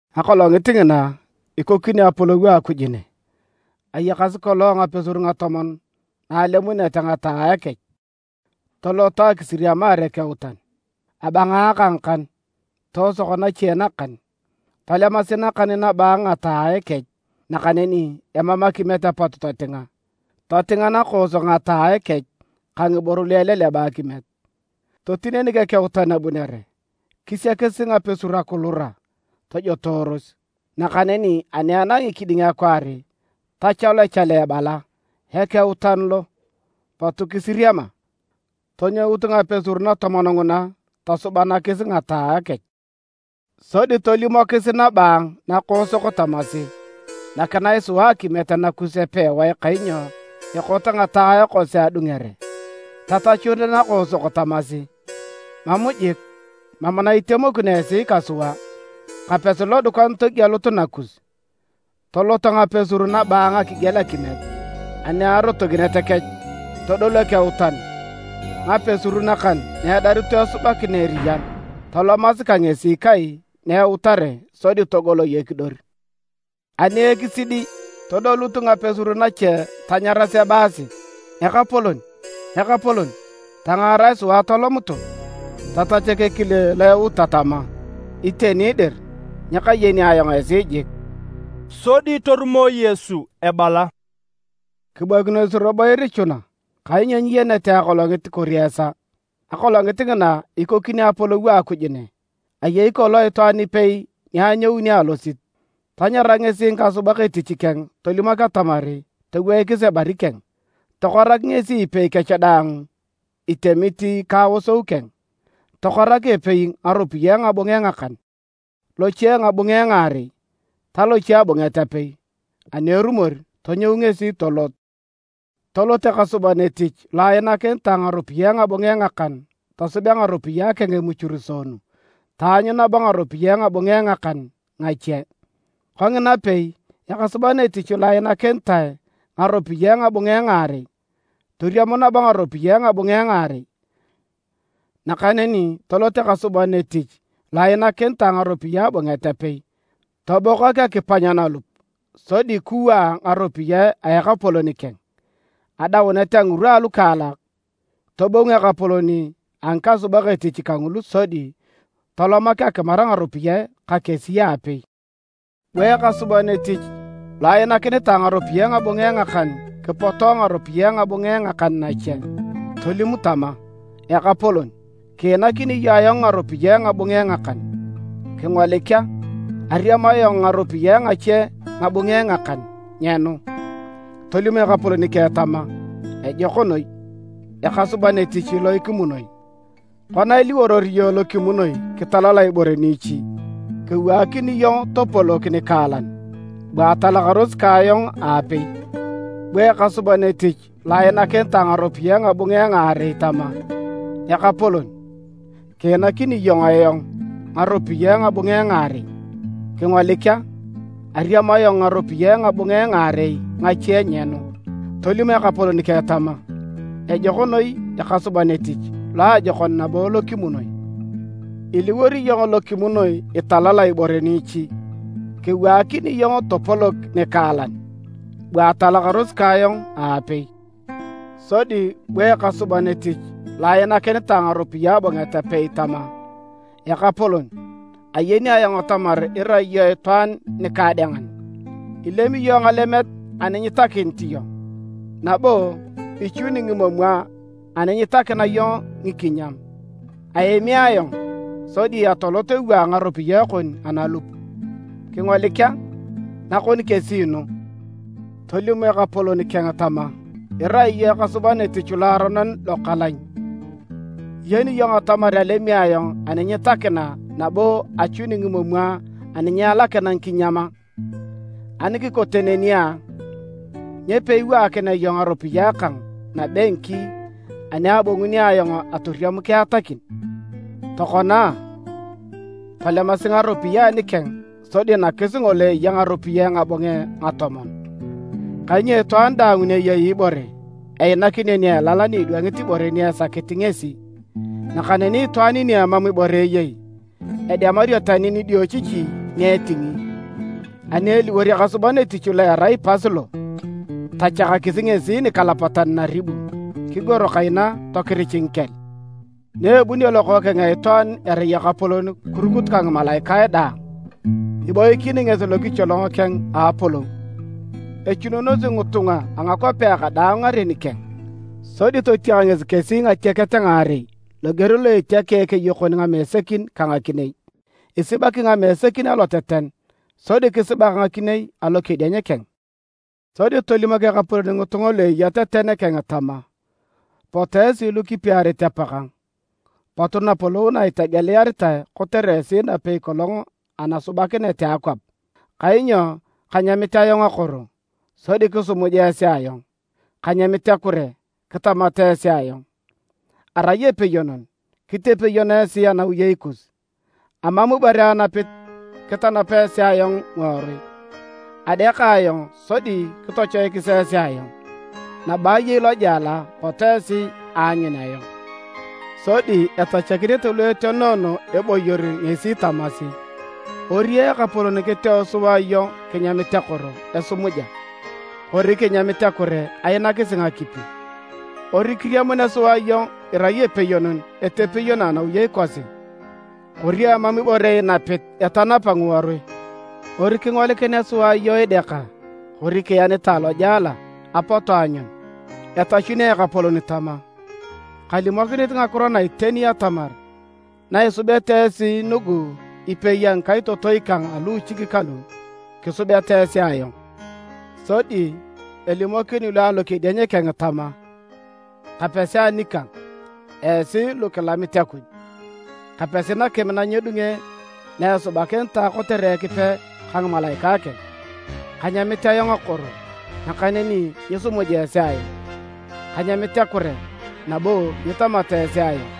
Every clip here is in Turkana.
“Akolongit ngina, ikokini Apolou a Akuj ne. Ayakasi kolong ngapesur ngatomon na alemunete ngataae kech, toloto akisiriamiar ekeutan. Abangaaka ngakan, toosok nache nakan. Tolemasi nakan nabaang ngataae kech nakaneni emam akimiet apot totinga. Totinga nakoosok ngataae kech ka ngiboro lu eleleba akimiet. Totinenik ekeutan abunere, kisiakis ngapesur akilura, tojotooros. “Nakaneni ani enangi kiding akwaar, tochalu echale ebala: ‘Ekeutan lo! Potu kisiriama!’ Tonyout ngapesur natomon nguna tosubanakis ngataae kech. Sodi tolimokis nabaang nakoosok tamasi: ‘Nakinae sua akimiet nakus epewae kainyo ekot ngataae kosi adungere.’ Tatachut nakoosok tamasi, ‘Mam jik! Mam na itemokino esi ka sua. Kapesi lodukan togielut nakus.’ Toloto ngapesur nabaang akigiel akimiet. Ani arotokinet kech, todolu ekeutan. Ngapesur nakan na edarito esubakina eriyan, tolomasi ka ngesi kai na eutare sodi togoloi ekidor. “Ani ekisidi, todolut ngapesur nache tanyaras ebaasi, ‘Ekapolon! Ekapolon! Tangaarae sua atolomutu’. Tatachak ekile lo euta tama: ‘Iteni dir, nyakayeni ayong esi jik.’” Sodi torumo Yesu ebala, “Kiboikinos robo irichuna, kainyo nyiyenete akolongit kori esaa. “Akolongit ngina ikokini Apolou a Akuj ne. Ayei kolong itwaan ipei ni anyouni alosit. Tanyara ngesi ngikasubak etich keng tolimok atamar toweikis ebari keng. Tokorak ngesi ipei kech daang itemit ka aosou keng. Tokorak epei ngaropiyae ngabunge ngakan, loche ngabunge ngaarei, ta loche abunget apei. Ani erumor, tonyou ngesi tolot. Tolot ekasuban etich lo ainakinitae ngaropiyae ngabunge ngakan tosubea ngaropiyae keng emuchuruseenu taanyu nabo ngaropiyae ngabunge ngakan ngache. Konginapei, ekasuban etich lo ainakinitae ngaropiyae ngabunge ngaarei, toriam nabo ngaropiyae ngabunge ngaarei. Nakaneni tolot ekasuban etich lo ainakinitae ngaropiyae abunget apei, tobokak akipany nalup, sodi kiwaa ngaropiyae a ekapolon keng. “Adaunet a ngirwa alukaalak, tobong ekapolon a ngikasubak etich kangulu sodi tolomak akimar ngaropiyae ka kesi aapei. Bu ekasuban etich lo ainakinitae ngaropiyae ngabunge ngakan kipoto ngaropiyae ngabunge ngakan nache. Tolim tama: ‘Ekapolon, kiinakini iyong ayong ngaropiyae ngabunge ngakan. Kingolik a! Ariam ayong ngaropiyae ngache ngabunge ngakan nyenu.’ Tolim ekapolon keng tama, ‘Ejok noi ekasuban etich lo kimunoi. Kona iliworor iyong lo kimunoi kitalala ibore niichi, kewaakini iyong topolok nikaalan. Bua atalakaros ka ayong aapei’. Bu ekasuban etich lo ainakinitae ngaropiyae ngabunge ngaarei tama, ‘Ekapolon, kiinakini iyong ayong ngaropiyae ngabunge ngaarei. Kingolik a! Ariam ayong ngaropiyae ngabunge ngaarei ngache nyenu.’ Tolim ekapolon keng tama: ‘Ejok noi ekasuban etich loajokon nabo lo kimunoi. Iliwor iyong lo kimunoi italala ibore niichi, kewaakini iyong topolok nikaalan. Bua atalakaros ka ayong aapei.’ Sodi bu ekasuban etich lo ainakinitae ngaropiyae abunget apei tama: ‘Ekapolon, ayeni ayong atamar irai iyong itwaan nikaadengan. Ilemi iyong ngalemet ani nyitakinit iyong, nabo ichuni ngimomwa ani nyitakina iyong ngikinyam. Aemi ayong, sodi atolot ewaa ngaropiyae kon analup. Kingolik a! Nakon kesi nu.’ Tolim ekapolon keng tama, ‘Irai iyong ekasuban etich loaronon lokalany! Iyeni iyong atamar alemi ayong ani nyitakina nabo achuni ngimomwa ani nyialakina ngikinyam a? Ani kikote neni a, nyo peiwaakinea iyong ngaropiyae kang nabengki ani abonguni ayong atoriam kiatakin? Tokona a, tolemasi ngaropiyae anikeng sodi nakis ngolo eya ngaropiyae ngabunge ngatomon. Kainyo itwaan daang ni eyei ibore, einakinio ni elal ni idwangi ibore ni esakit ngesi. Nakaneni itwaan ni emam ibore eyei, edemario tani nidiochichi ni etingi. Ani eliwor ekasuban etich lo erai pas lo, tochakasi ngesi nikalapatan naribu, kigor kaina tokirich ngikel.’ “Naebunio Lokookeng a Itwaan erai Ekapolon kirukut ka ngimalaikae daang, iboikin ngesi lokicholong keng a Apolou. Echununosi ngitunga a ngakwapea kadaang ngaren keng. Sodi totiak ngesi kesi ngatiaket ngaarei loger lo etiakea ekeyokon ngamesekin ka ngakinei. Isibaki ngamesekin aloteten sodi kisibak ngakinei alokedieny keng. Sodi tolimok Ekapolon ngitunga lu eya teten keng tama, ‘Potu esi lukipiarit Apakang! Potu Napolou na itegeliaritae kotere esi napei kolong anasubakinet a akwap. Kainyo kanyamit ayong akoro, sodi kisimuja esi ayong. Kanyamit akure, kitamat esi ayong. Arai epeyonon, kitepeyon esi anawiyei kus. Amam ibore anapit kitanap esi ayong ngiworui. Adeaka ayong sodi kitochoikis esi ayong, nabo ayei lojela pot esi aanyun ayong.’ “Sodi etachakinete lu etenoono eboyor ngesi tamasi, ‘Ori Ekapolon kiteo sua iyong kinyamit akoro esumuja, kori kinyamit akure ainakisi ngakipi? Ori kiriamunea sua iyong irai epeyonon etepeyono anawiyei kosi, kori emam ibore inapit etanapa ngiworui? Ori kingolikinea sua iyong ideaka kori kienitae alojela apotu aanyun?’ Etachuni Ekapolon tama, ‘Kalimokinit ngakiro na iteni atamar na isubeta esi nugu epei a ngikaitotoi kang a luuchik kalu, kisubeta esi ayong!’ Sodi elimokini lu alokedieny keng tama: ‘Kapesi anikang, esi lu kilamit Akuj. Kapesi nakim na nyedunge na esubakinitae kotere Ekipe ka ngimalaikae keng! Kanyamit ayong akoro, nakaneni nyisimuja esi ayong. Kanyamit akure nabo nyitamata esi ayong.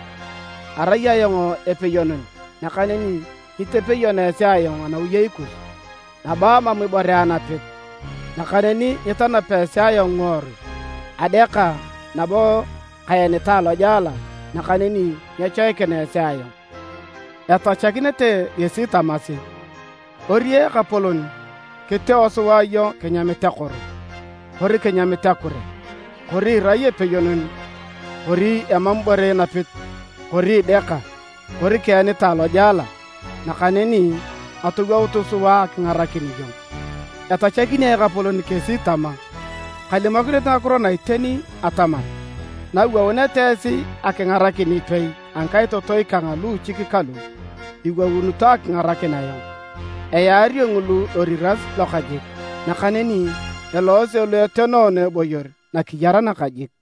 Arai ayong epeyonon nakaneni nyitepeyono esi ayong anawiyei kus, nabo amam ibore anapit nakaneni nyitanapa esi ayong ngiworui. Adeaka nabo kaenitae alojela, nakaneni nyechoikina esi ayong.’ Etachakinete ngesi tamasi, ‘Ori Ekapolon kiteo sua iyong kinyamit akoro kori kinyamit akure kori irai epeyonon kori emam ibore inapit kori ideaka kori kienitae alojela, nakaneni atowoutu sua akingarakin iyong?’ Etachakini Ekapolon kesi tama, ‘Kalimokinit ngakiro na iteni atamar, na iwouneta esi akingarakin epei a ngikaitotoi kang a luuchik kalu, iwounito akingarakin ayong.’ Eyaario ngulu loriras lokajik. Nakaneni eloose lu etenoono eboyor nakiyar nakajik.”